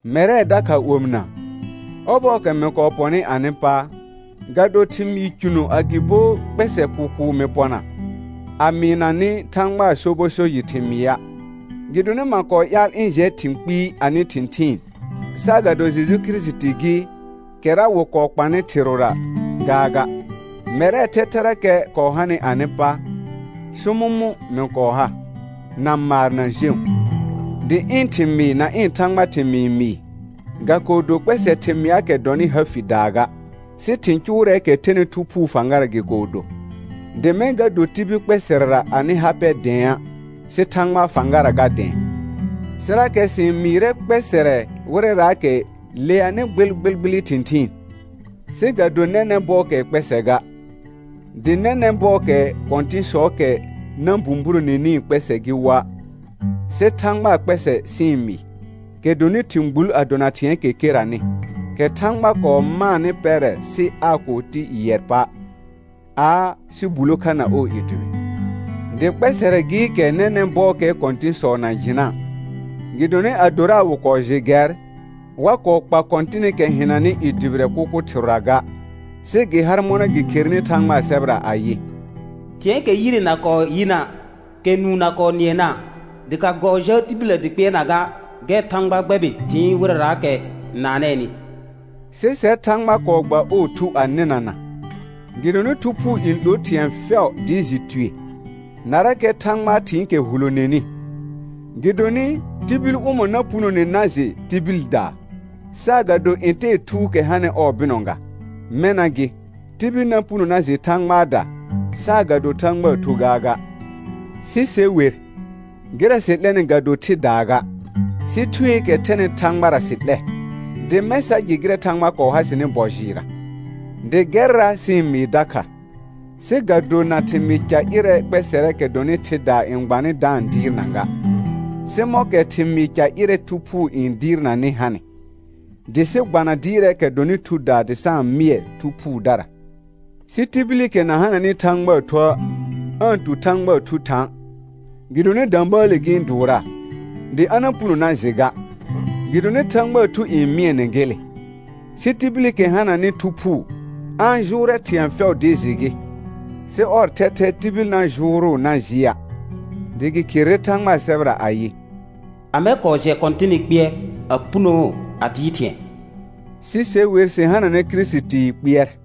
Mɛrɛ dakha omɩna, ɔbɔɔkɛ mɩ kɔɔ pɔnɩ anɩ pa, ga do thɩmɩɩ cʋno agɩbo kpɛsɛ kʋkʋʋ mɩ pɔna, a mɩɩna nɩ Thãgbaa sobɔ so jɩ thɩmɩa'; gɩdonɩ ma kɔɔ ƴaal ɩ̃ jɛ thɩ̃ kpɩɩ anɩ thɩ̃thɩɩn, saagado Jeju Kirisiti gɩ, kɛra wɩ kɔɔ kpanɩ thɩrʋra gaaga. Mɛrɛɛ thɛthɛrakɛ kɔɔ hanɩ anɩ pa, sʋmʋmʋ̃ mɩ kɔɔ ha, na maar na jẽu. Dɩ ɩ̃ thɩmɩɩ na ɩ̃ Thãgba thɩmɩɩ mɩɩ, ga kɔɔ do kpɛsɛ thɩmɩaakɛ dɔnɩ ha fidaa ga, sɩ thɩ̃ cʋʋrɛɛkɛ thɛnɩ Thu Phuu fãgara gɩ kɔɔ do, dɩ mɛ̃ ga do tibil kpɛsɛrɛra anɩ ha pɛ dɛ̃a', sɩ Thãgbaa fãgara ga dɛ̃ɛ. Sɩrakɛ sɩ-n mɩɩrɛ kpɛsɛrɛ wɩrɛraakɛ leanɩ gbɩlgbɩlgbɩlɩ thɩ̃thɩɩn, sɩ ga do nɛnɛ̃ bɔɔkɛɛ kpɛsɛ ga, dɩ nɛnɛ̃ bɔɔkɛɛ kɔ̃tɩ̃sɔɔkɛ na bũburonenii kpɛsɛ gɩ woa'. Sɩ Thãgbaa kpɛsɛ sɩ-n mɩɩ, kɛ dɔnɩ thɩ̃ gbul a dona thɩ̃ɛɛkɛ keranɩ, kɛ Thãgba kɔɔ maanɩ pɛrɛ sɩ aa kɔɔ ti yɩɛr pa' aa, sɩ bulo kha na ɔɔ i dʋbɩ. Dɩ kpɛsɛrɛ gɩɩkɛ nɛnɛ̃ bɔɔkɛɛ kɔ̃tɩ̃sɔ na jɩna', gɩdonɩ adora wɩ kɔɔ jɩ gɛr, wa kɔɔ kpa Kɔ̃tɩnɩkɛ hɩnanɩ i dʋbɩrɛ kʋkʋ thɩrʋra ga; sɩ gɩ har mɔna gɩ kherenɩ Thãgbaa sɛbɛra ayɩ: «Thɩ̃ɛɛkɛ yire na kɔɔ yɩna', kɛ nũu na kɔɔ nɩɛna', dɩ ga kɔɔ jaa tibillə dɩ kpɩɛrna ga, gɛr Thãgba gbɛbɩ thɩɩn wɩrɛraakɛ n naanɛɛnɩ.» Sɩ sɛr Thãgba kɔɔ gba ɔɔ Thu a nɩnana, gɩdonɩ Thu Phuu n 'lor thɩ̃ɛ fɛʋ dɩ jɩ tue, narakɛ Thãgbaa thɩ̃ɩkɛ huloneni. Gɩdonɩ, tibil ʋmɔ̃ na punone na jɩ tibildaa, saagado ntɛɛ thuukɛ hanɩ ɔɔ bɩnɔ ga? Mɛna gɩ, tibil na puno na jɩ Thãgbaada, saagado Thãgbaa Thu gaaga. Sɩ se wer, gɩrɛ sɩ 'lɛnɩ ga do thɩdaa ga, sɩ Thueekɛ thɛnɩ Thãgbara sɩ 'lɛ, dɩ mɛ̃ sa jɩ gɩrɛ Thãgba kɔɔ ha sɩnɩ bɔ jɩɩrra. Dɩ gɛrra sɩ-n mɩɩ dakha, sɩ ga do na thɩmɩɩ ca ƴɩrɛ kpɛsɛrɛɛkɛ dɔnɩ thɩdaa n gbanɩ da-n dɩɩrna ga, sɩ mɔ̃kɛ thɩmɩɩ ca ƴɩrɛ Thu Phuu n dɩɩrnanɩ hanɩ, dɩ sɩ gbana dɩɩrɛɛkɛ dɔnɩ thudaa dɩ sa-n mɩɛ Thu Phuudara. Sɩ tibilikɛ na hananɩ Thãgbaa Thuə', aa-n tu Thãgbaa Thu thã', gɩdonɩ də̃bəəle gɩ-n dʋʋraa, dɩ a na puno na jɩ ga, gɩdonɩ Thãgbaa Thu n mɩɛnɛ gele. Sɩ tibilikɛ hananɩ Thu Phuu, a-n jʋʋrɛ thɩ̃ɛ fɛʋ dɩ jɩ gɩ, sɩ ɔr thɛthɛ tibil na jʋʋrʋʋ na jɩa'; dɩ gɩ kherere Thãgbaa sɛbɛra ayɩ: «Amɛ kɔɔ jɛ Kɔ̃tɩnɩ kpɩɛr a punoo a dɩɩr thɩ̃ɛ?» Sɩ se wer sɩ hananɛ Kirisitii kpɩɛr.